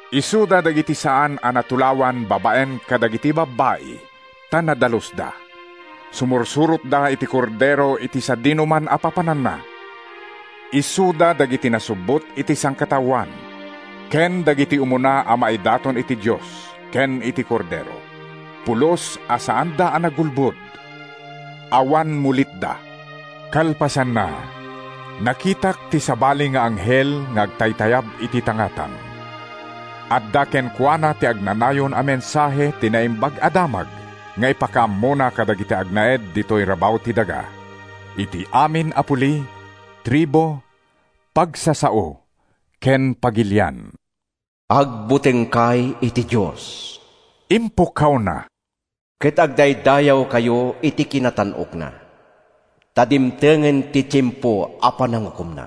Isuda dagiti saan a natulawan babaen kadagiti babbai, ta nadalusda. Sumursurotda iti Kordero iti sadinoman a papananna. Isuda dagiti nasubbot iti sangkataoan ken dagiti umuna a maidaton iti Dios ken iti Kordero. Pulos a saanda a nagulbod. Awan mulitda. Kalpasanna, nakitak ti sabali nga anghel nga agtaytayab iti tangatang. Adda kenkuana ti agnanayon a mensahe ti Naimbag a Damag nga ipakaammona kadagiti agnaed ditoy rabaw ti daga, iti amin a puli, tribu, pagsasao ken pagilian. “Agbutengkay iti Dios,” impukkawna, “ket agdaydayawkayo iti kinatan-okna! Ta dimtengen ti tiempo a panangukomna.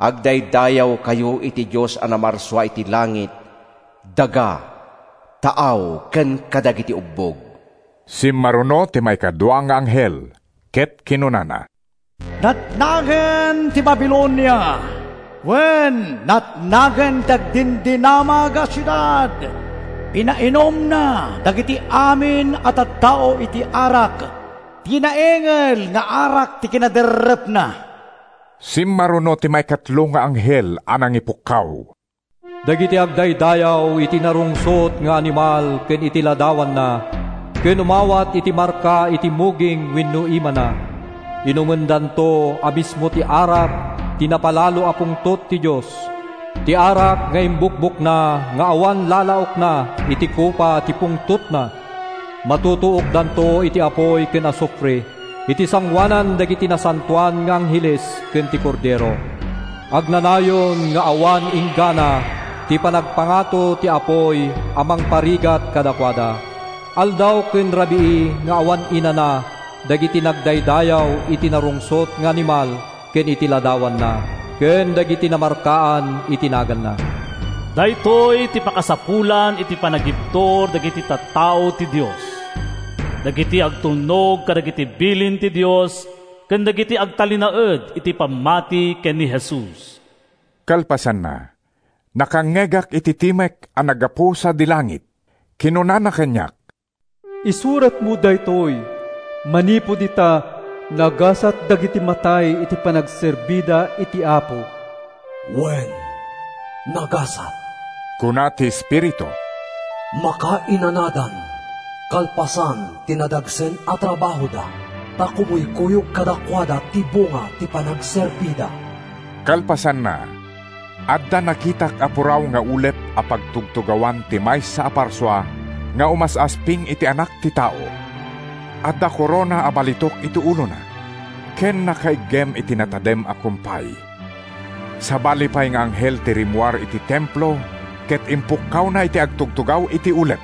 Agdaydayawkayo iti Dios a namarsua iti langit, daga, taaw ken kadagiti ubbog.” Simmaruno ti maikadua nga anghel ket kinunana, “Natnagen ti Babilonia! Wen, natnagen ti agdindinamag a siudad! Pinainumna dagiti amin a tattao iti arak—ti naingel nga arak ti kinaderrepna.” Simmaruno ti maikatlo nga anghel a nangipukkaw, “Dagiti agdaydayaw iti narungsot nga animal ken iti ladawanna, ken umawat iti marka iti muging wenno imana, inumendanto a mismo ti arak ti napalalo a pungtot ti Dios, ti arak nga imbukbokna nga awan lalaokna iti kopa ti pungtotna! Matutuokdanto iti apuy ken asufre iti sangoanan dagiti nasantoan nga angheles ken ti Kordero. Agnanayon nga awan inggana ti panagpangato ti apuy a mangparparigat kadakuada. Aldaw ken rabii nga awan inana dagiti nagdaydayaw iti narungsot nga animal ken iti ladawanna, ken dagiti namarkaan iti naganna.” Daytoy ti pakasapulan iti panagibtur dagiti tattao ti Dios, dagiti agtulnog kadagiti bilin ti Dios ken dagiti agtalinaed iti pammati ken ni Jesus. Kalpasanna, nakangngegak iti timek a naggapu sadi langit. Kinunana kaniak, “Isuratmo daytoy: Manipud ita, nagasat dagiti matay iti panagserbida iti Apo.” “Wen, nagasat,” kuna ti Espiritu. “Makainanadan kalpasan ti nadagsen a trabahoda ta kumuykuyog kadakuada ti bunga ti panagserbida.” Kalpasanna, adda nakitak a puraw nga ulep a pagtugtugawan ti maysa a parsua nga umas-asping iti anak ti tao. Adda korona a balitok iti ulona ken nakaiggem iti natadem a kumpay. Sabali pay nga anghel ti rimmuar iti templo ket impukkawna iti agtutugaw iti ulep,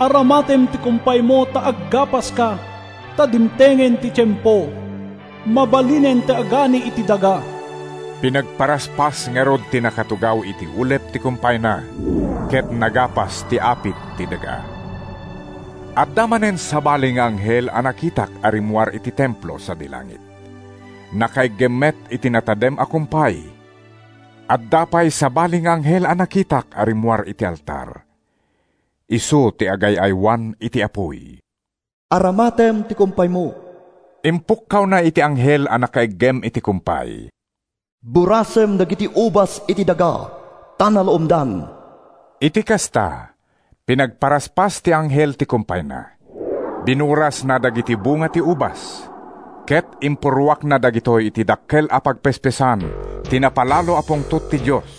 “Aramatem ti kumpaymo ta aggapaska, ta dimtengen ti tiempo. Mabalinen ti agani iti daga!” Pinagparaspas ngarud ti nakatugaw iti ulep ti kumpayna ket nagapas ti apit ti daga. Adda manen sabali nga anghel a nakitak a rimmuar iti templo sadi langit. Nakaiggem met iti natadem a kumpay. Adda pay sabali nga anghel a nakitak a rimmuar iti altar. Isu ti agay-aywan iti apuy. “Aramatem ti kumpaymo,” impukkawna iti anghel a nakaiggem iti kumpay. “Burasem dagiti ubas iti daga, ta naluomdan!” Iti kasta, pinagparaspas ti anghel ti kumpayna, binurasna dagiti bunga ti ubas, ket impurruakna dagitoy iti dakkel a pagpespesan ti napalalo a pungtot ti Dios.